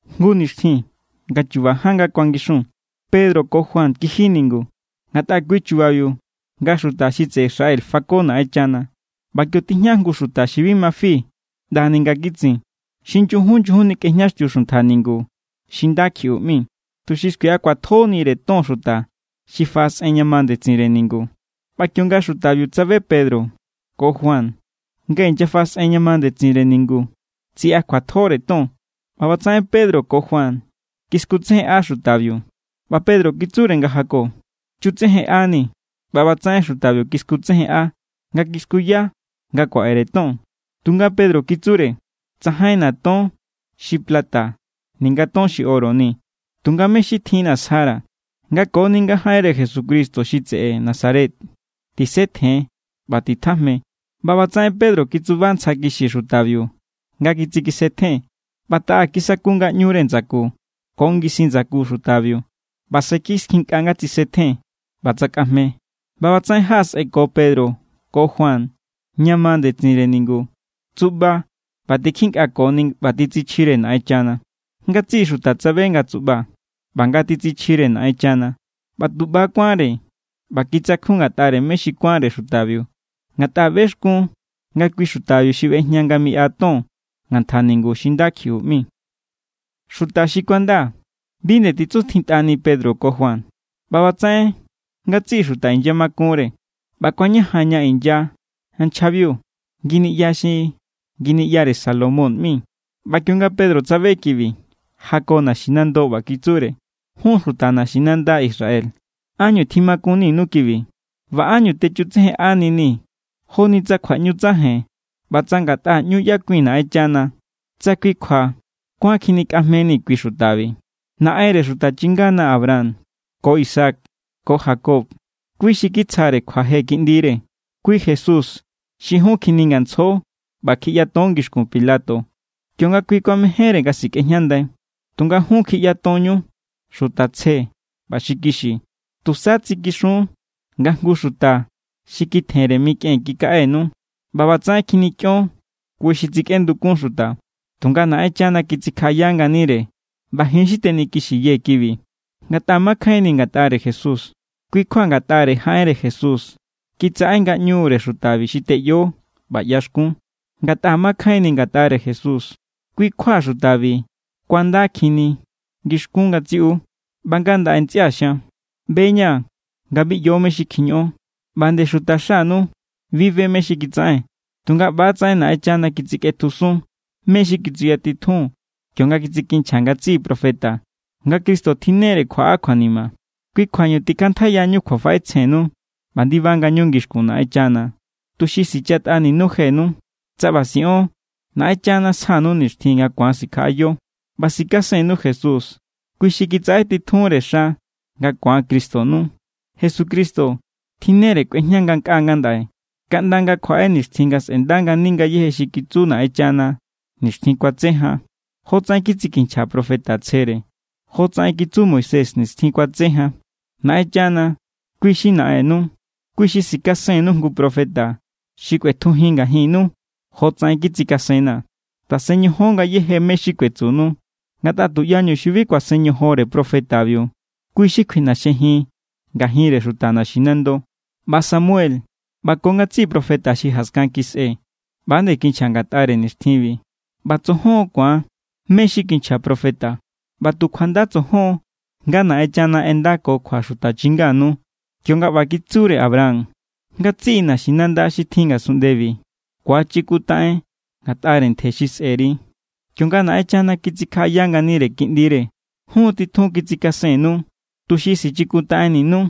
Jngu nixtjin nga chuba ján nga kuangixun, Pedro ko Juan kiji ningu, ngatꞌa kui= chubabiu nga xuta xi tseꞌe Israel fako Naꞌenchana. ꞌBa kio tijña jngu xuta xi bi ma fi ꞌndani nga kitsin. Xi nyujun nyujun nikꞌejñaxtiu xuntja ningu xi Nda Kjiꞌu ꞌmi, tuxi skuiꞌa kjuatjonire ton xuta xi faꞌasꞌen ña ma ndetsinre ningu. ꞌBa kionga xutabiu tsabe Pedro ko Juan nga inyafaꞌasꞌen ña ma ndetsinre ningu, tsiꞌakjuatjore ton. ꞌBa ꞌbatsaꞌen Pedro ko Juan kiskutsejenꞌa xutabiu. ꞌBa Pedro kitsure nga jako: —Chutsejenꞌanii̱. ꞌBa ꞌbatsaꞌen xutabiu kiskutsejenꞌa nga kiskuya nga kuaꞌere ton. Tunga Pedro kitsure: —Tsajainna̱ ton xi plata ninga ton xi oro ni, tunga mé= xi tjinna̱ sjara̱. Nga koni nga jaꞌenre Jesucristo xi Nazaret tseꞌe, tisetjen ꞌba titjajme. ꞌBa ꞌbatsaꞌen Pedro kitsuba ntsja kixi xutabiu nga kitsikisetjen, ꞌba taꞌa kisaku ngaꞌñure ndsaku ko ngisin ndsaku xutabiu. ꞌBa se kiskjinkꞌa nga tsisetjen, ꞌba tsakꞌajme. ꞌBa ꞌbatsaꞌen jaꞌasꞌenko Pedro ko Juan ña ma ndetsinre ningu. Tsuꞌba ꞌba tikjinkꞌakoni ꞌba titsichjire Naꞌenchana. Ngatsiꞌi xuta tsabe nga tsuꞌba ꞌba nga titsichjire Naꞌenchana, ꞌba tu ꞌba= kuánre ꞌba kitsakjun ngatꞌare mé xi kuánre xutabiu. Ngatꞌa bexkun nga kui xutabiu xi ꞌbejña nga miꞌa ton ngantja ningu xi Nda Kjiꞌu ꞌmi. Xuta xi kuanda, bi nde titsuntjintꞌani Pedro ko Juan. ꞌBa ꞌbatsaꞌen ngatsiꞌi xuta inyamakunre ꞌba kuañajan ña inya nchjabiu nginiꞌya xi Nginiꞌyare Salomón ꞌmi. ꞌBa kionga Pedro tsabe kibi, jako naxinando, ꞌba kitsure: —Jun xuta naxinanda Israel, ¿ánñu tjimakunninu kibi? ¿ꞌBa ánñu techutsejenꞌaninii̱ joni tsa kjuaꞌñu tsaja̱i̱n ꞌba tsa ngatꞌa nga ꞌñu ꞌyakui̱n Naꞌenchana, tsa kui kjua kuán kjinikꞌajmeni̱ kui xutabi? Naꞌenre xuta chingana Abraham ko Isaac ko Jacob, kui= xi kitsjare kjuaje Kiꞌndire. Kui Jesús xi jun kjiningantsjo ꞌba kjiꞌyaton ngixkun Pilato, kionga kui kuamejénre nga sikꞌejñandai. Tunga jun kjiꞌyatonñu xuta tsje ꞌba xi kixi. Tusa tsikixun nga jngu xuta xi kitjenre mikꞌen kikaꞌenu. ꞌBa ꞌbatsaꞌen kjinikꞌion kui xi tsikꞌendukun xuta. Tunga Naꞌenchana kitsikjaꞌaya nganire ꞌba ji̱n= xi tenikixiyee̱ kibi. Ngatꞌa makjainni̱ ngatꞌare Jesús, kui= kjua ngatꞌare jaꞌenre Jesús kitsaꞌe ngaꞌñure xutabi xi teꞌyo ꞌba ꞌyaxkun. Ngatꞌa makjainni̱ ngatꞌare Jesús, kui= kjua xutabi kuandakjinni ngixkun ngatsiꞌu. ’ꞌBa ngandaꞌe, ntsꞌia̱ xian, ꞌbe=ña̱ nga bi ꞌyo mé= xi kjiñoꞌon. ꞌBa nde xutaxanu bi be mé= xi kitsaꞌen. Tunga ꞌba=tsaꞌen Naꞌenchana kitsikꞌetjusun mé= xi kitsuyatitjun kionga kitsikinchja ngatsiꞌi profeta, nga Cristo tjinnere kjuaꞌa kjuanima. Kui kjuañu tikꞌantjaiyañu kjuafaꞌetsjennu ꞌba ndiba ngañu ngixkun Naꞌenchana, tuxi sichatꞌaninu jenu. Tsa ꞌba siꞌon, Naꞌenchana sjanu nixtjin nga ku̱an sikjaꞌayo ꞌba sikasennu Jesús, kui xi kitsaꞌe titjunre xa nga ku̱an Cristonu. Jesucristo tjinnere nga kꞌuejña ngankꞌaa ngandaꞌe, kaꞌnda nga kjuaꞌe nixtjin nga sꞌe̱nda ngani ngayéje xi kitsu Naꞌenchana nixtjin kuatse jan, jotsaꞌen kitsikinchja profeta tsjere. Jotsaꞌen kitsu Moisés nixtjin kuatse jan: “Naꞌenchana, kui= xi Naꞌennu. Kui xi sikasennu jngu profeta xi kꞌuetjujin ngajinnu, jotsaꞌen kitsikasenna̱. Tasen ñojon ngayéje mé= xi kuetsunu, ngatꞌa tuꞌyañu xi bi kuasen ñojonre profetabiu, kui= xi kjuiꞌnaxjejin ngajinre xuta naxinando.” ’ꞌBa Samuel ꞌba ko ngatsiꞌi profeta xi jaskan kisꞌe ꞌba=nde kinchja ngatꞌare nixtjinbi. ꞌBa tsojon= ku̱an mé= xi kinchja profeta, ꞌba tu kjuanda tsojon nga Naꞌenchana ꞌendako kjua xuta chinganu, kionga ꞌba kitsure Abraham: “Ngatsiꞌi naxinanda xi tjin ngasunꞌndebi ku̱achikuntaꞌen ngatꞌare ntje xi sꞌe̱ri.” Kionga Naꞌenchana kitsikjaꞌaya nganire Kiꞌndire, jun= titjun kitsikasennu, tuxi sichikuntaꞌenninu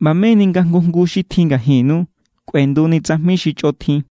ꞌba meni nga jngu jngu xi tjin ngajinnu kꞌuenduni tsajmi xi chꞌotjin.